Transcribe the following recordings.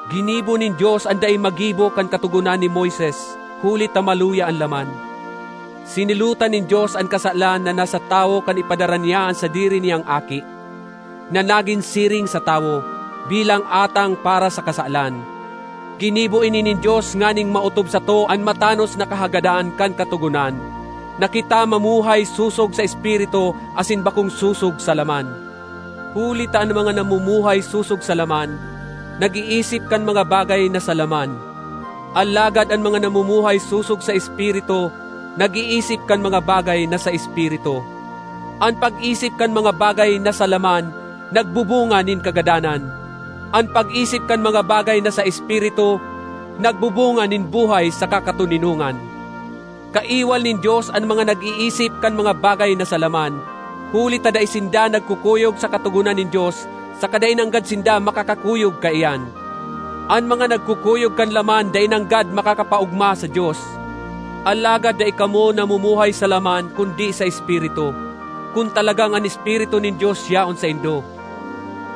Ginibo nin Dios an dai magibo kan Katogonan ni Moises huli ta maluya an laman. Sinilotan nin Dios an kasalan na nasa tawo kan ipadara niya an sadiri niyang Aki, na nagin siring sa tawo, bilang atang para sa kasalan. Ginibo ini nin Dios nganing maotob sato an matanos na kahagadan kan Katogonan, na kita mamuhay sosog sa Espiritu asin bakong sosog sa laman. Huli ta an mga namumuhay sosog sa laman, nag-iisip kan mga bagay na sa laman; alagad an mga namumuhay sosog sa Espiritu, nag-iisip kan mga bagay na sa Espiritu. An pag-isip kan mga bagay na sa laman nagbubunga nin kagadanan; an pag-isip kan mga bagay na sa Espiritu nagbubunga nin buhay saka katoninongan. Kaiwal nin Dios an mga nag-iisip kan mga bagay na sa laman, huli ta dai sinda nagkukuyog sa katogonan nin Dios saka dai nanggad sinda makakakuyog kaiyan. An mga nagkukuyog kan laman dai nanggad makakapaogma sa Dios. Alagad dai kamo namumuhay sa laman kundi sa Espiritu, kun talagang an Espiritu nin Dios yaon saindo.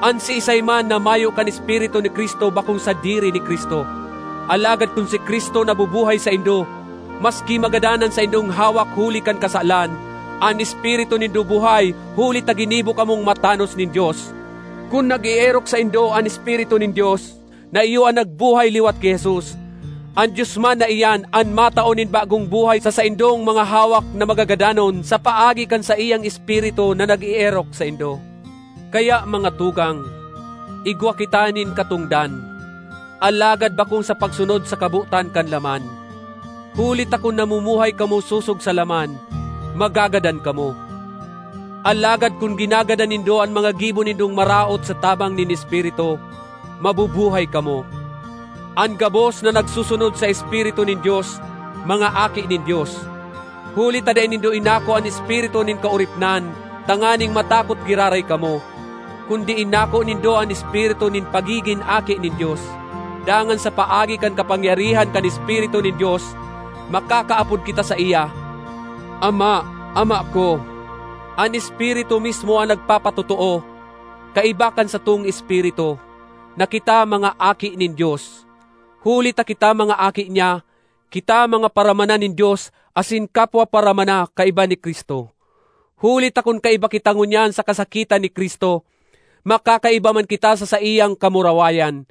An siisay man na mayo kan Espiritu ni Cristo bakong sadiri ni Cristo. Alagad kun si Cristo nabubuhay saindo, maski magadan an saindong hawak huli kan kasalan, an espiritu nindo buhay huli ta ginibo kamong matanos nin Dios. Kun nag-eerok saindo an Espiritu nin Dios na iyo an nagbuhay liwat ki Jesus, an Dios man na iyan an matao nin bagong buhay sa saindong mga hawak na magagadanon sa paagi kan saiyang Espiritu na nag-eerok saindo. Kaya mga tugang, igwa kita nin katongdan, alagad bakong sa pagsunod sa kabotan kan laman. Huli ta kun namumuhay kamo sosog sa laman, magagadan kamo; alagad kun ginagadan nindo an mga gibo nindong maraot sa tabang nin Espiritu, mabubuhay kamo. An gabos na nagsusunod sa Espiritu nin Dios, mga aki nin Dios. Huli ta dai nindo inako an espiritu nin kaoripnan tanganing matakot giraray kamo, kundi inako nindo an espiritu nin pagigin aki nin Dios, dangan sa paagi kan kapangyarihan kan Espiritu nin Dios, makakaapod kita saiya, “Ama, Ama ko!” An Espiritu mismo an nagpapatotoo, kaiba kan satong espiritu, na kita mga aki nin Dios. Huli ta kita mga aki niya, kita mga paramana nin Dios asin kapwa paramana kaiba ni Cristo. Huli ta kun kaiba kita ngunyan sa kasakitan ni Cristo, makakaiba man kita sa saiyang kamurawayan.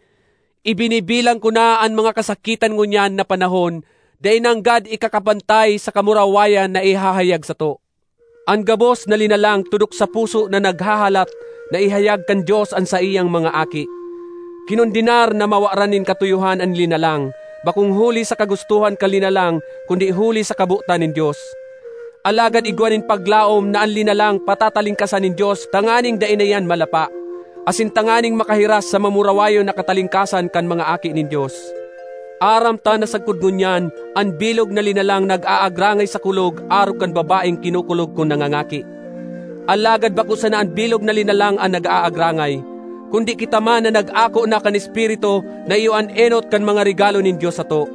Ibinibilang ko na an mga kasakitan ngunyan na panahon dai nanggad ikakapantay sa kamurawayan na ihahayag sato. An gabos na linalang tudok sa puso na naghahalat na ihayag kan Dios an saiyang mga aki. Kinondenar na mawaran nin katuyohan an linalang, bakong huli sa kagustohan kan linalang kundi huli sa kabotan nin Dios. Alagad igwa nin paglaom na an linalang patatalingkasan nin Dios tanganing dai na iyan malapa, asin tanganing makahiras sa mamurawayon na katalingkasan kan mga aki nin Dios. Aram ta na sagkod ngunyan an bilog na linalang nag-aagrangay sa kulog arog kan babaeng kinukulog kun nangangaki. Alagad bako sana an bilog na linalang an nag-aagrangay, kundi kita man na nag-ako na kan Espiritu na iyo an enot kan mga regalo nin Dios sato.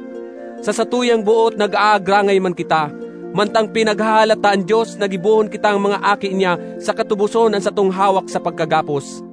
Sa satuyang boot nag-aagrangay man kita, mantang pinaghahalat ta an Dios na gibohon kitang mga aki niya saka tuboson an satong hawak sa pagkagapos.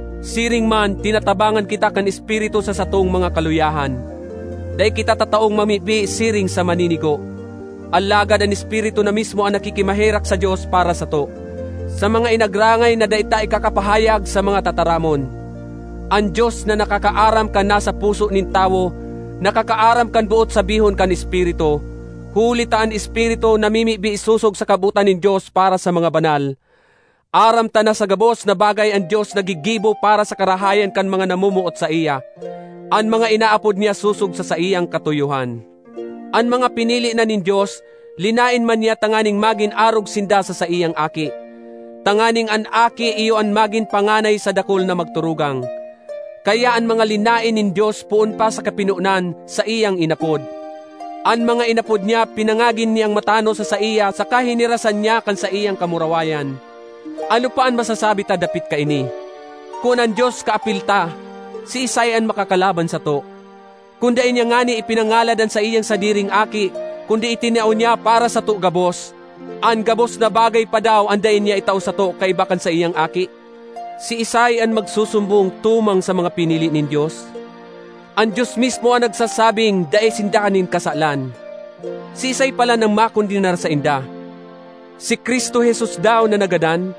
Siring man tinatabangan kita kan Espiritu sa satong mga kaluyahan. Dai kita tataong mamibi siring sa maninigo, alagad an Espiritu na mismo an nakikimaherak sa Dios para sato, sa mga inagrangay na dai ta ikakapahayag sa mga tataramon. An Dios na nakakaaram kan nasa puso nin tawo, nakakaaram kan boot sabihon kan Espiritu, huli ta an Espiritu namimibi sosog sa kabotan nin Dios para sa mga banal. Aram ta na sa gabos na bagay an Dios naggigibo para sa karahayan kan mga namomoot saiya—an mga inaapod niya sosog sa saiyang katuyohan. An mga pinili na nin Dios, linaen man niya tanganing magin arog sinda sa saiyang Aki, tanganing an Aki iyo an magin panganay sa dakul na magturugang. Kaya an mga linaen nin Dios poon pa sa kapinonan, saiyang inapod; an mga inapod niya pinangagin niyang matanos sa saiya saka hinirasan niya kan saiyang kamurawayan. Ano pa an masasabi ta dapit kaini? Kun an Dios kaapil ta, siisay an makakalaban sato? Kun dai niya ngani ipinangalad an saiyang sadiring Aki, kundi itinao niya para sato gabos, an gabos na bagay pa daw an dai niya itao sato kaiba kan saiyang Aki? Siisay an magsusumbong tumang sa mga pinili nin Dios? An Dios mismo an nagsasabing dai sinda nin kasalan. Siisay palan an makondenar sainda? Si Cristo Jesus daw na nagadan,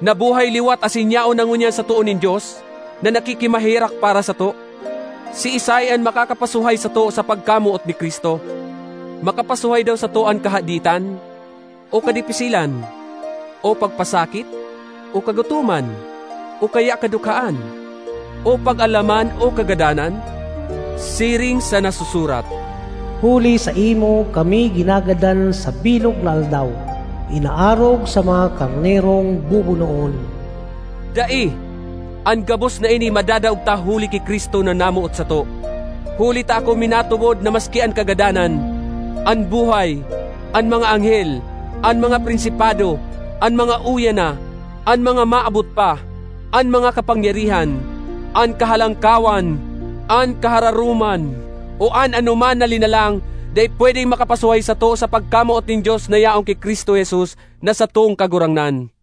nabuhay liwat asin yaon na ngunyan sa too nin Dios, na nakikimaherak para sato? Siisay an makakapasuhay sato sa pagkamoot ni Cristo? Makapasuhay daw sato an kahaditan, o kadipisilan, o pagpasakit, o kagutoman, o kaya kadukhaan, o pag-alaman, o kagadanan? Siring sa nasusurat, “Huli saimo kami ginagadan sa bilog na aldaw; inaarog sa mga karnerong bubunoon.” Dai! An gabos na ini madadaog ta huli ki Cristo, na namoot sato! Huli ta ako minatubod na maski an kagadanan, an buhay, an mga anghel, an mga prinsipado, an mga uya na, an mga maabot pa, an mga kapangyarihan, an kahalangkawan, an kahararoman, o an anoman na linalang dai pwedeng makapasuhay sato sa pagkamoot nin Dios na yaon ki Cristo Jesus na satong Kagurangnan.